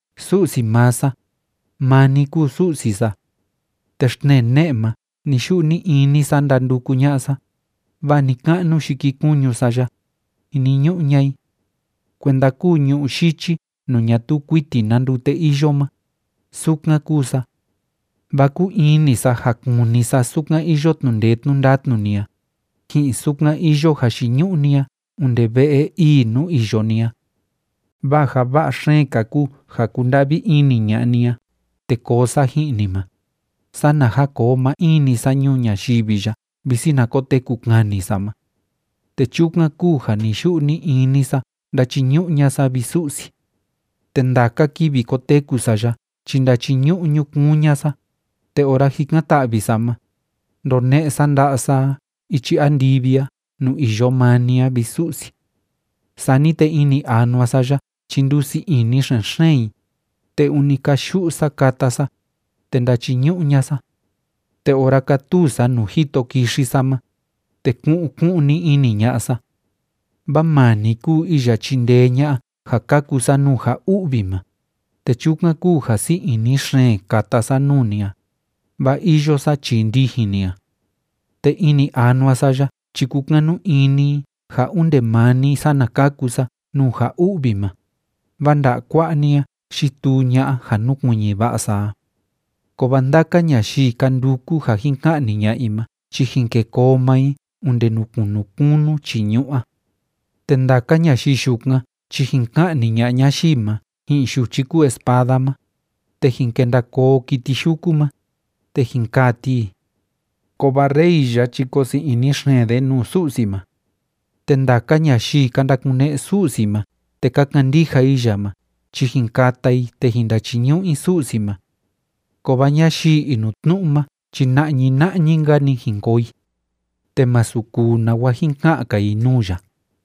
Su'si maa sa, maa ni kúu Su'si sa. Te xtnee ne'e ma ni‑yu'u ni‑ini sa ndanduku ña'a sa, vaa ni‑ka'nu yikikuñu sa ya, jiniñu'u ña'a i. Kuenda kúu ñu'ú yichi nuu ñatuu kuiti na ndute iyo ma, sukan kúu sa. Vaa kúu ini sa ja kuni sa sukan iyo tnu'u ndee tnu'u ndatnu ni a, ji'in sukan iyo jayiñu'u ni a onde ve'e ii nuu iyo ni a. Vaa ja va'a xeen‑ka kúu ja kúnda'vi ini ña'a ni a te koo sa ji'in ni ma, sana ja koo maa in‑ni sa ñuu ñayivi ya visi na koteku kani sa ma. Te chukan kúu ja ni‑yu'u ni‑ini sa ndachiñu'u ña'a sa, vi Su'si. Te ndaka kivi koteku sa ya chi ndachiñu'u ñukuun ña'a sa, te ora jikan‑ta'vi sa ma, ndone'e sa nda'a sa a ichi andivi a nuu iyo maa ni a, vi Su'si. Sani te ini anua sa ya chi ndusii ini xen‑xeen i, te ûni kayu'u sa kata sa, te ndachiñu'u ña'a sa. Te ora kátuu sa nuu jito kixi sa ma, te ku'un ku'un‑ni ini ña'a sa. Vaa maa ni kúu iya chindee ña'a ja kaku sa nuu ja u'vi ma, te chukan kúu ja sii ini xeen kata sa nuu ni a, vaa iyo sa chii ndijin ni a. Te ini anua sa ya chi kúkanu ini i ja onde maa ni sana kaku sa nuu ja u'vi ma, vaa nda'a kua'a ni a yituu ña'a ja núkuiñi va'a sa a. Kovaa ndaka ñayii ka nduku ja jin ka'ni ña'a i ma chi jin kê koo maa i onde nuu kunu kunu chii ñu'ú a. Te ndaka ñayii yukan chi jin ka'ni ña'a ñayii ma ji'in yuchi kúu espada ma, te jin kenda koo kiti yuku ma, te jin kaa ti i. Kovaa rey ya chi koo sii ini xeen de nuu Su'si ma. Te ndaka ñayii ka ndakune'e Su'si ma te ka kandija i ya ma chi jin kata i te jin ndachiñu'u i Su'si ma. Kovaa ñayii inutnu'u ma chi na'ñi na'ñi‑nka‑ni jin koo i, te masu kuu nawa jin ka'an‑ka i nuu ya.